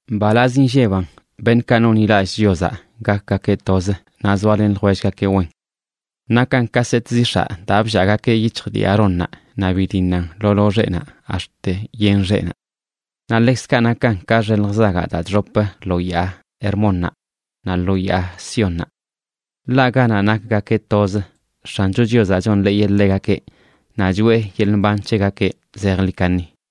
¡Mbalaz inlleban beṉꞌkaꞌ nonḻilallꞌ Chiozaꞌ gakgakeꞌ toz naꞌ zoalen ljwellgakeꞌ wen! Nakan ka set zix̱aꞌ daa bllaagakeꞌ yic̱hj dii Aarónnaꞌ naꞌ bidiṉan lo loxeꞌnaꞌ ax̱t yen xeꞌnaꞌ. Naꞌ ḻekzkaꞌ nakan ka xelj zagaꞌ daa chxop lo yaa Hermónnaꞌ, naꞌ lo yaa Siónnaꞌ. Ḻaꞌ ganaꞌ nakgakeꞌ toz, X̱ancho Chiozaꞌ chonḻeeyeꞌ ḻegakeꞌ naꞌ choeꞌ yeḻꞌ mban c̱hegakeꞌ zejḻi kaṉi.